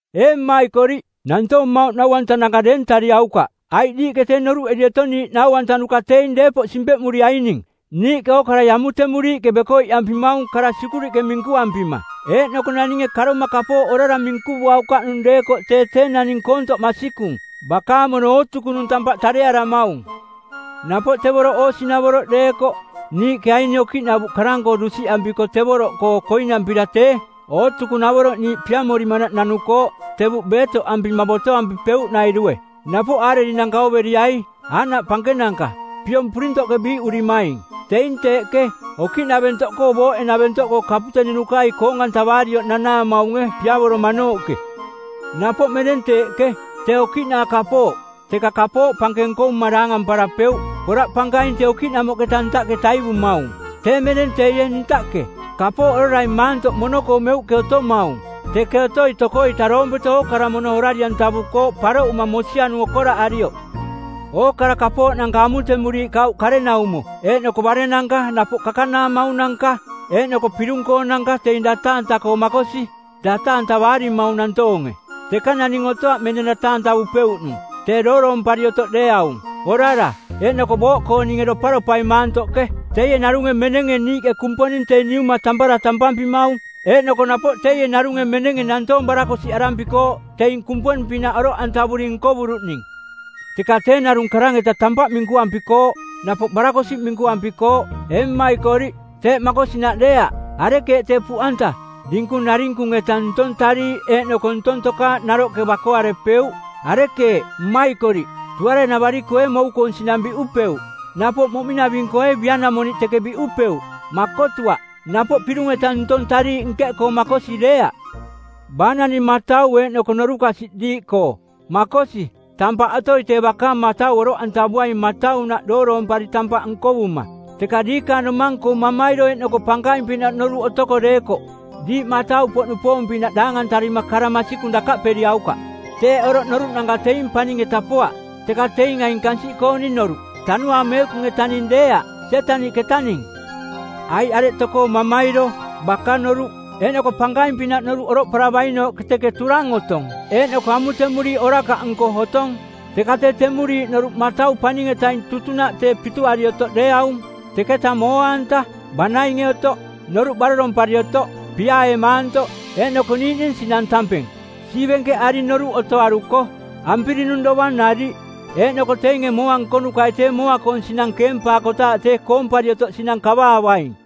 Ee mmaikoriꞌ, nantoong mmauꞌ nau-antananka deeng-antarariaukaꞌ, aiꞌ diiꞌke tee noruꞌeri otong niiꞌ nau-antanuka teing deepoꞌ simpeꞌmuriaining. Niiꞌke ookarai amutemuriiꞌke bekoiꞌampimaung kara sikuriꞌke minkuampima, eeꞌnoko naninge karoma kapooꞌ orara minkuvuaukaꞌnung deekoꞌ tee tee naning koontoꞌ masikung, bakaang mono ootukunung tampaꞌ tarearamaung. Napoꞌ tevoroꞌ oosinavoroꞌ deekoꞌ, niiꞌke aini okiꞌnavuꞌ karang-koo dusiꞌampiko tevoroꞌkoo koinampira tee ootukunavoroꞌ niiꞌ piamorimanaꞌ nanukooꞌ tevuꞌ beetoꞌampima botoampipeuꞌnairue. Napoꞌ aarerinanka˜ ooveriai, aaꞌnaꞌ pankenanka, piong purintoꞌke biiꞌurimaing, teing teeꞌke, okiꞌnaventoꞌkoo booꞌe-naventoꞌkoo kaputeninukai koong-antavaarioꞌ nanaamaunge piavoromanooꞌke. Napoꞌ meneng teeꞌke, tee okiꞌnaa kapooꞌ, teka kapooꞌ pankeng nkovuma daangamparapeuꞌ. Poraꞌ pankaing tee okiꞌnamoꞌketa ntaꞌke taivumaung. Tee meneng teie ntaꞌke. Kapooꞌ orarai maantoꞌ mono-koo meuꞌke otomaung. Teke otoi toko-ita doompeto ookara mono orari-antavukooꞌ paroꞌuma mosianung okoraꞌarioꞌ. Ookara kapooꞌnanka amutemuriiꞌ kauꞌ karenaumo eeꞌnoko barennanka napoꞌ kakanaamaunanka eeꞌnoko pirung-koonanka teing data-anta-koo makosi; data-antavaarimaung nantoonge. Teka naning otoaꞌ meneng data-antavupeuꞌnung, tee dooroompari otoꞌ deeaung, orara, eeꞌnoko booꞌkooninge doparopai maantoꞌke. Teie narunge menenge niiꞌke Kumponing tee Niuma tampara tampampimaung eeꞌnoko napoꞌ teie narunge menenge nantoong barakosiꞌarampikooꞌ, teing Kumponing-pinaꞌ oroꞌantavuri nkovuruꞌning. Teka tee narung karang-eta tampaꞌ minkuampikooꞌ; napoꞌ barakosiꞌ minkuampikooꞌ. Ee mmaikoriꞌ, teeꞌ makosinaꞌ deeaꞌ. Arekeeꞌ tee puꞌanta, dinkung narinkung-eta ntong tariiꞌ eeꞌnoko ntong tokaaꞌ naroꞌke bakoarepeuꞌ? Arekeeꞌ, mmaikoriꞌ, tuare-navari-koo ee mou-koong sinang biꞌupeuꞌ? Napoꞌ moꞌming-naving-koo ee bia-namoniꞌ teke biꞌupeuꞌ? Makotuaꞌ. Napoꞌ pirung-eta ntong tariiꞌ nkeꞌkoo makosi deeaꞌ. Baa naning matau eeꞌnoko norukasiꞌ diiꞌkoo? Makosi, tampaꞌ otoi tee bakaang matau oroꞌantavuaing mataunaꞌ dooroompari tampaꞌ nkovuma. Teka diikaang domang-koo mamairo eeꞌnoko pankaing-pinaꞌ noruꞌ otoko deekoꞌ, diiꞌ matau-poꞌnupoong-pinaꞌ daangantarima kara masikung dakaꞌperiaukaꞌ. Teeꞌ oroꞌ noruꞌnanka teing paning-eta poaꞌ, teka teing aing kansiꞌkooning noruꞌ; Tanuaang Meekung-etaning deeaꞌ, Sietaniꞌketaning. Aiꞌ areꞌ tokoo mamairo, baka-noruꞌ, eeꞌnoko pankaing-pinaꞌ noruꞌ oroꞌparavainooꞌke teke turang otong eeꞌnoko amutemuriiꞌ orakaꞌnko otong. Teka tee temuriiꞌ noruꞌ matau paning-etaing tutunaꞌ tee pituari otoꞌ deeaung, teketa mooa-anta, banainge otoꞌ, noruꞌ barorompari otoꞌ, piaae maantoꞌ, eeꞌnoko niiꞌning sinang tampeng, siivenkeꞌari noruꞌ otoaruko, ampirinung dovang nariꞌ. Eeꞌnoko teinge mooa nkonukai tee mooa-koong sinang keempaakotaaꞌ tee koompari otoꞌ sinang kavaavaing.